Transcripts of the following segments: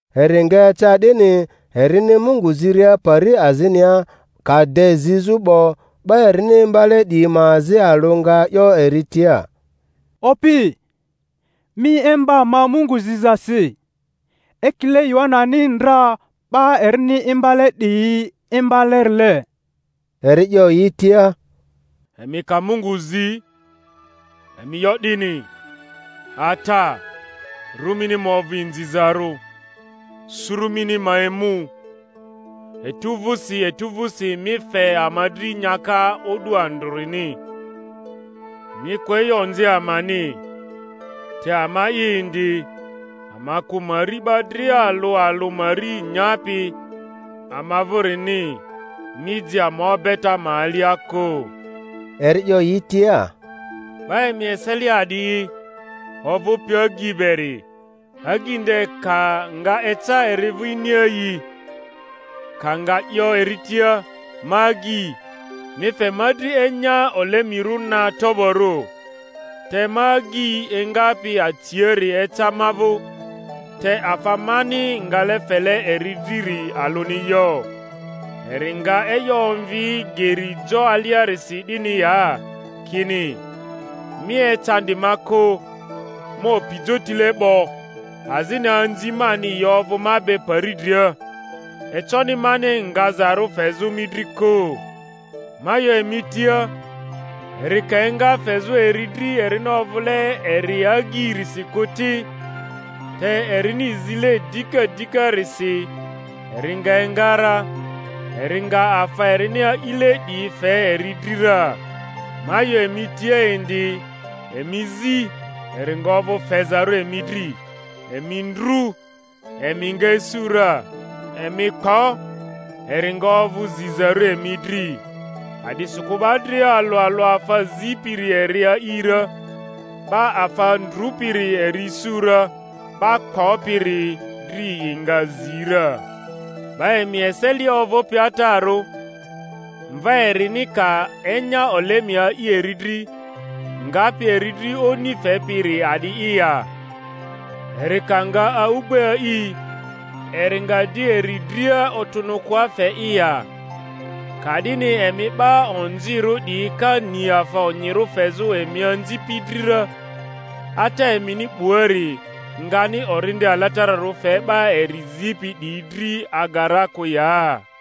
Eri nga eca 'dini, erini Mungu ziria pari azinia, ka de zizᴜ 'bo, 'ba erini imbale 'diyi ma azi alᴜ nga 'yo eri tia, Opi, mi imba ama Mungu zizasi, ekile Yohanani ndra 'ba erini imbale 'diyi imbalerile. Eri 'yo yi tia, Emi ka Mungu zi, emi 'yo 'dini: Ata, ru mini ma ovᴜ inzizarᴜ. Suru mini ma emu. Etu vᴜsi etu vᴜsi mi fe ama dri nyaka o'du andrᴜniri; mi kᴜ e'yo onzi amani, te ama'i indi, ama kᴜ mari 'ba dria alᴜ alᴜ mari nyapi ama vᴜrini; mi ji ama obeta ma alia kᴜ. Eri 'yo yi tia, Ba emi eselia a'di'i, ovᴜpi agyi beri, agyi nde ka nga eca eri vᴜ iniaayi, ka nga 'yo eri tia, Ma agyi, mi fe ma dri enya olemirᴜ na toborᴜ; te ma agyi engapi aciari eca ma vᴜ, te afa mani ngale fele eri driri alᴜni yo; eri nga e'yo omvi geri jo aliarisi 'dini ya, kini, Mi ecandi ma kᴜ; ma opi jotile 'bo, azini anzi mani yi ovᴜ ma be pari dria; econi mani ngazarᴜ fezᴜ mi dri kᴜ? Ma 'yo emi tia, Eri ka enga fezᴜ eri dri erini ovᴜle eri agyirisi kᴜ ti, te erini zile dika dikarisi eri nga enga ra, eri nga afa erini a'ile 'diyi fe eri dri ra. Ma 'yo emi tia indi, Emi zi, eri nga ovᴜ fezarᴜ emi dri; emi ndru, emi nga isu ra; emi kpo, eri nga ovᴜ zizarᴜ emi dri. A'disikᴜ 'ba dria alᴜ alᴜ afa zipiri eri a'i ra, 'ba afa ndrᴜpiri eri isu ra, 'ba kpopiri dri yi nga zi ra. 'Ba emi eselia ovᴜpi atarᴜ, mva erini ka enya olemi a'i eri dri, ngapi eri dri oni fepi'iri a'di'i ya? Eri ka nga a'ugbe a'i, eri nga di eri dria otᴜnᴜkᴜa fe'i ya? Ka'dini emi 'ba onzirᴜ 'diyi ka ni afa onyirᴜ fezᴜ emi anzipi dri ra, Ata emini 'buari:ngani Orindi Alatararᴜ fe 'ba eri zipi 'diyi dri aga ra kᴜ ya?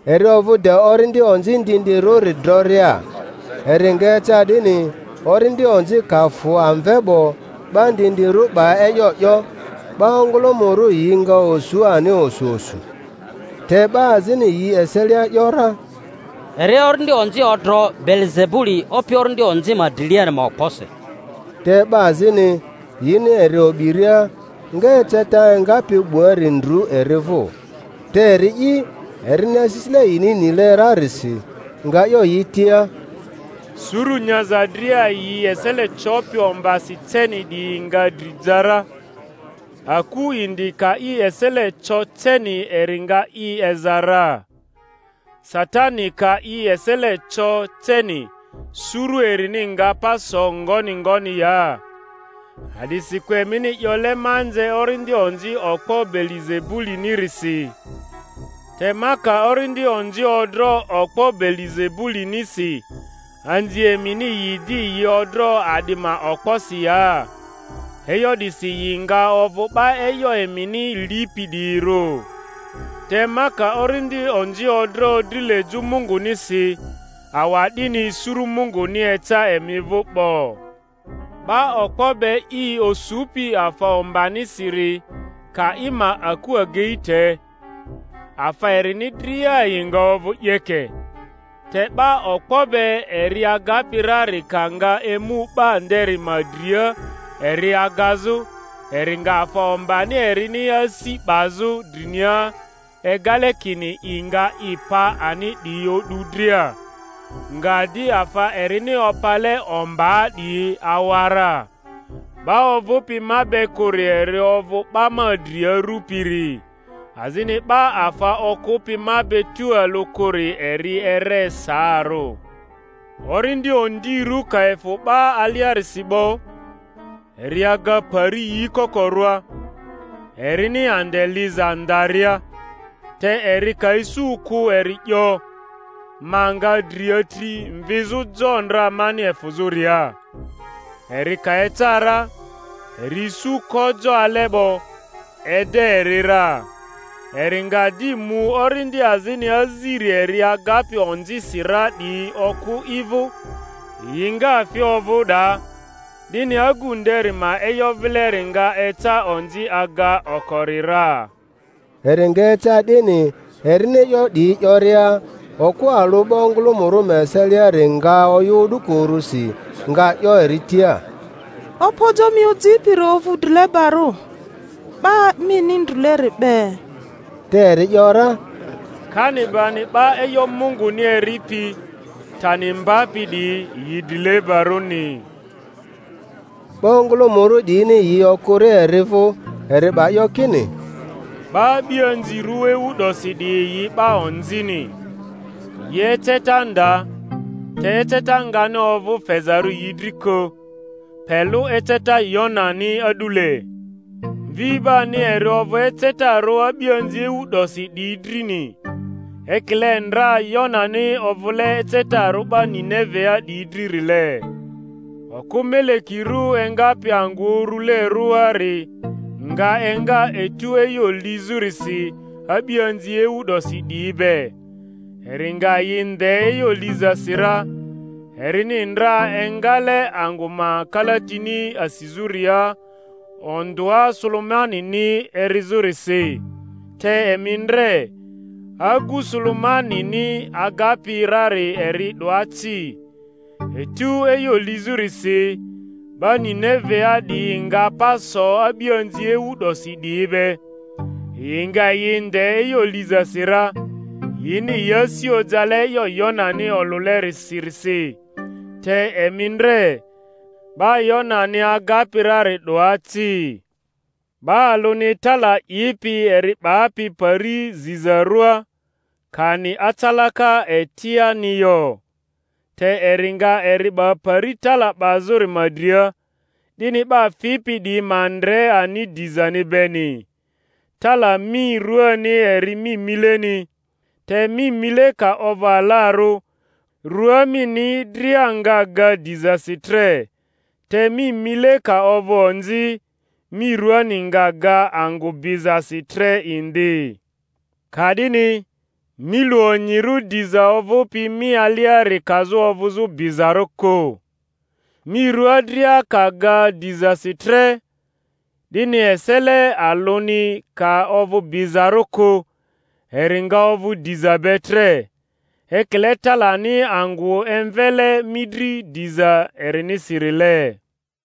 Eri ovᴜ de orindi onzi ndindi-rᴜri droria. Eri nga eca 'dini, orindi onzi ka fᴜ amve 'bo, 'ba ndindirᴜ 'ba e'yo 'yo; 'ba ongᴜlᴜmᴜrᴜ yi nga osu ani osu osu. Te 'ba azini yi eselia ‘yora, Eri orindi onzi odro Beelizebuli opi orindi onzi ma driliari ma okposi; te 'ba azini, yini eri o'biria, nga eceta engapi 'buari ndru eri vᴜ. Te eri'i, erini asisile yini nile rarisi, nga 'yo yi tia, Suru nyaza dria yi esele copi ombasi ceni 'diyi nga dri ja ra, aku indi ka i esele co ceni eri nga i eza ra. Satani ka i esele co ceni, suru erini nga pa so ngoni ngoni ya? A'disikᴜ emini 'yole ma nze orindi onzi okpo Beelizebulinirisi. Te ma ka orindi onzi odro okpo Beelizebulinisi, anzi emini yi di yi odro a'di ma okposi ya? E'yo 'disi yi nga ovᴜ 'ba e'yo emini lipi 'diyirᴜ. Te ma ka orindi onzi odro drilejᴜ Mungunisi, awa'dini suru Munguni eca emi vᴜ 'bo. 'Ba okpo be i osupi afa ombanisiri ka i ma aku agei te, afa erini dria yi nga ovᴜ 'yeke; te 'ba okpo be eri agapi rari ka nga emu 'ba nderi ma dria eri agazᴜ, eri nga afa ombani erini asi 'bazᴜ drinia egale kini i nga i pa ani 'diyi o'du dria, nga di afa erini opale ombaa 'diyi awa ra. 'Ba ovᴜpi ma be kᴜri eri ovᴜ 'ba ma dri arupiri, azini 'ba afa okᴜpi ma be tᴜalᴜ kᴜri eri ere saarᴜ. Orindi ondirᴜ ka efᴜ 'ba aliarisi 'bo, eri aga pari yi kokorᴜa, erini ande liza ndaria; te eri ka isu kᴜ eri 'yo, Ma nga dri atri mvizᴜ jo ndra mani efᴜzᴜria. Eri ka eca ra, eri isu ko jo ale 'bo, ede eri ra. Eri nga di mu orindi azini aziri eri agapi onzisi ra 'diyi okᴜ i vᴜ, yi nga fi ovᴜ 'daa; 'dini agu nderi ma e'yo vileri nga eca onzi aga okori ra. Eri nga eca 'dini, erini e'yo 'diyi 'yoria, okᴜ alᴜ 'ba ongᴜlᴜmᴜrᴜ ma eseliari nga oyᴜ o'duko urusi, nga 'yo eri tia, Opojo mi ojipiri ovᴜ drilebarᴜ, ba mini ndrᴜleri be. Te eri ‘yora, Kani bani 'ba e'yo Munguni eripi, tani mbapi 'diyi, yi drilebarᴜni! 'Ba ongᴜlᴜmᴜrᴜ 'diyini yi okᴜria eri vᴜ, eri 'ba 'yo kini, 'Ba a'bianzirᴜ ewu 'dosi 'diyi yi 'ba onzini; yi eceta nda, te eceta ngani ovᴜ fezarᴜ yi dri kᴜ, pe lᴜ eceta Yonani a'dule. Mvi 'bani eri ovᴜ ecetarᴜ a'bianzi ewu 'dosi 'diyi drini, ekile ndra Yonani ovᴜle ecetarᴜ 'ba Ninevea 'diyi dririle. Okᴜ melekirᴜ engapi angᴜ uru-lerᴜari nga enga etu e'yo lizᴜrisi a'bianzi ewu 'dosi 'diyi be, eri nga yi nde e'yo lizasi ra; erini ndra engale angᴜ ma kalatini asizᴜria ondᴜa Sulemanini erizᴜrisi; te emi ndre, agu Sulemanini agapi rari eri 'doa ci. Etu e'yo lizᴜrisi 'ba Ninevea 'diyi nga pa so a'bianzi ewu 'dosi 'diyi be, yi nga yi nde e'yo lizasi ra; yini yi asi ojale e'yo Yonani olᴜleri-sirisi; te emi ndre, 'ba Yonani agapi rari 'doa ci. 'Ba alᴜni tala 'ipi eri 'bapi pari zizarᴜa, kani acalaka etiani yo, te eri nga eri 'ba pari tala 'bazᴜri ma dria, 'dini 'ba fipi 'diyi ma ndre ani dizani beni. Tala mi ruani eri mi mileni; te mi mile ka ovᴜ alarᴜ, rua mini dria nga ga dizasi tre; te mi mile ka ovᴜ onzi, mi ruani nga ga angᴜ bizasi tre indi. Ka'dini mi lu onyirᴜ diza ovᴜpi mi aliari kazᴜ ovᴜzᴜ bizarᴜ kᴜ. Mi rua dria ka ga dizasi tre, 'dini esele alᴜni ka ovᴜ bizarᴜ kᴜ, eri nga ovᴜ diza be tre, ekile talani angᴜ emvele mi dri diza erinisirile.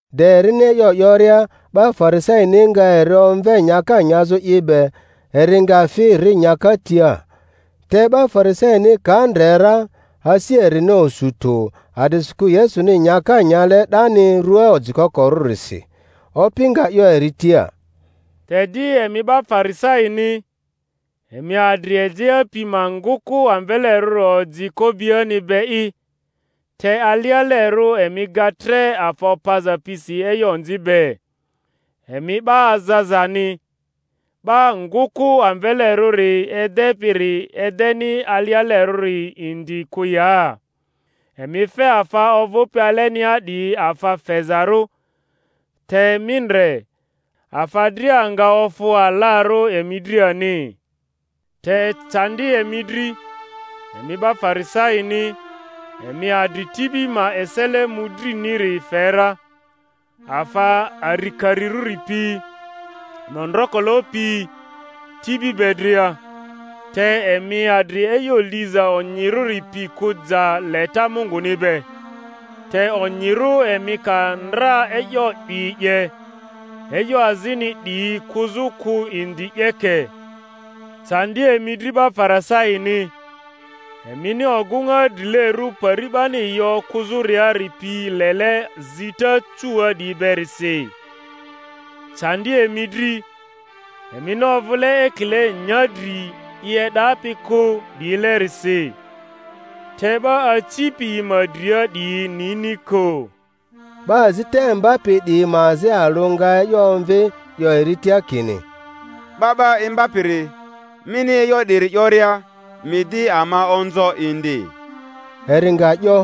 De erini e'yo 'yoria, 'ba Farisaini nga eri omve nyaka nyazᴜ i be; eri nga fi, ri nyaka tia. Te 'ba Farisaini ka ndre ra, asi erini osu tᴜ a'disikᴜ Yesuni nyaka nyale 'dani rᴜa ojikokorᴜrisi. Opi nga 'yo eri tia, Te di emi 'ba Farisaini, emi adri ejea pi ma ngᴜkᴜ amvelerᴜri oji ko'biani be'i, te alialerᴜ emi ga tre afa opaza pisi e'yo onzi be. Emi 'ba azazani! 'Ba ngᴜkᴜ amvelerᴜri edepiri edeni alialerᴜri indi kᴜ ya? Emi fe afa ovᴜpi alenia 'diyi afa fezarᴜ; te mi ndre, afa dria nga ofᴜ alarᴜ emi dri ani. Te candi emi dri, emi 'ba Farisaini! emi adri tibi ma esele mᴜdriniri fe ra, afa arikarirᴜri pi, mondrokolo pi, tibi be dria, te emi adri e'yo liza onyirᴜri pi kᴜ ja leta Munguni be; te onyirᴜ emi ka ndra e'yo 'diyi 'ye, e'yo azini 'diyi kᴜzᴜ kᴜ indi 'yeke. Candi emi dri 'ba Farisaini! emini ogᴜŋa drilerᴜ pari 'bani yi okᴜzᴜriari pi lele zita cuua 'diyi berisi. Candi emi dri! emini ovᴜle ekile nyadri i e'dapi kᴜ 'diyilerisi, te 'ba acipi yi ma dria 'diyi nini kᴜ. 'Ba azita imbapi 'diyi ma azi alᴜ nga e'yo omvi, 'yo eri tia kini, 'Ba 'ba Imbapiri, mini e'yo 'diri 'yoria mi di ama onzo indi. Eri nga 'yo,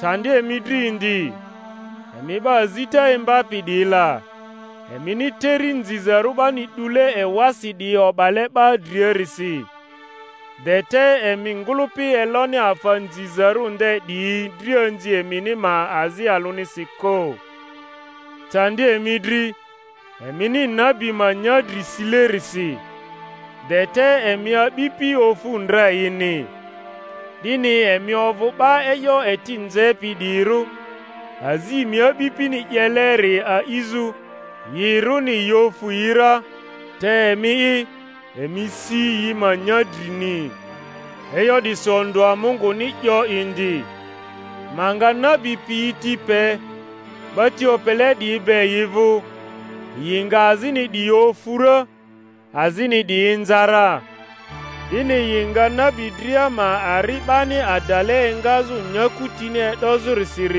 Candi emi dri indi, emi 'ba azita imbapi 'diyi la! emini teri nzizarᴜ 'bani 'dule ewasi 'diyi o'bale 'ba driarisi, de te emi ngᴜlᴜpi eloni afa nzizarᴜ nde 'diyi drianzi emini ma azi alᴜnisi kᴜ. Candi emi dri! emini nabi ma nyadri silerisi, de te emi a'bipi ofᴜ ndra yini. 'Dini emi ovᴜ 'ba e'yo eti nzepi 'diyirᴜ, azi emi a'bipini 'yeleri a'izᴜ; yirᴜni yi ofᴜ yi ra, te emi'i, emi si yi ma nyadrini. E'yo 'disi ondᴜa Munguni 'yo indi, Ma nga nabi piyi ti pe 'ba ti opele 'diyi be yi vᴜ, yi nga azini 'diyi ofu ra, azini 'diyi inza ra, 'dini yi nga nabi dria ma ari 'bani adale engazᴜ nyaku tini e'dozᴜrisir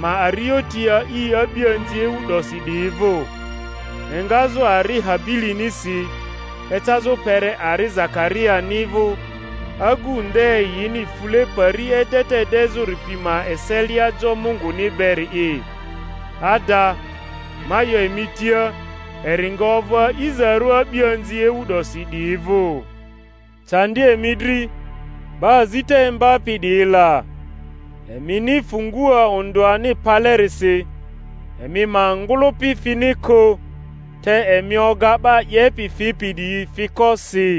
ma arioti a'i a'bianzi ewu 'dosi 'diyi vᴜ, engazᴜ ari Habilinisi ecazᴜ kpere ari Zakariani vᴜ, agu nde yini fule pari edeta edezᴜri pi ma eselia jo Munguni beri'i. Ada, ma 'yo emi tia, eri nga ovᴜ a'izarᴜ a'bianzi ewu 'dosi 'diyi vᴜ. Candi emi dri, 'ba azita imbapi 'diyi la! emini fungua ondᴜani palerisi; emi ma ngᴜlᴜpi fini kᴜ, te emi oga 'ba 'yepi fipi 'diyi fiko si.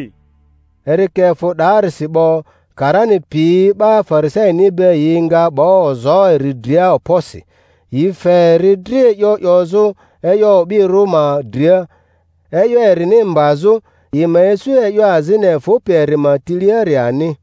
Eri ka efᴜ 'daarisi 'bo, karani piyi 'ba Farisaini be yi nga 'ba ozo eri dria okposi, yi fe eri dri e'yo 'yozᴜ e'yo o'birᴜ ma dria, e'yo erini mbazᴜ, yi ma isu e'yo azini efᴜpi eri ma tiliari ani.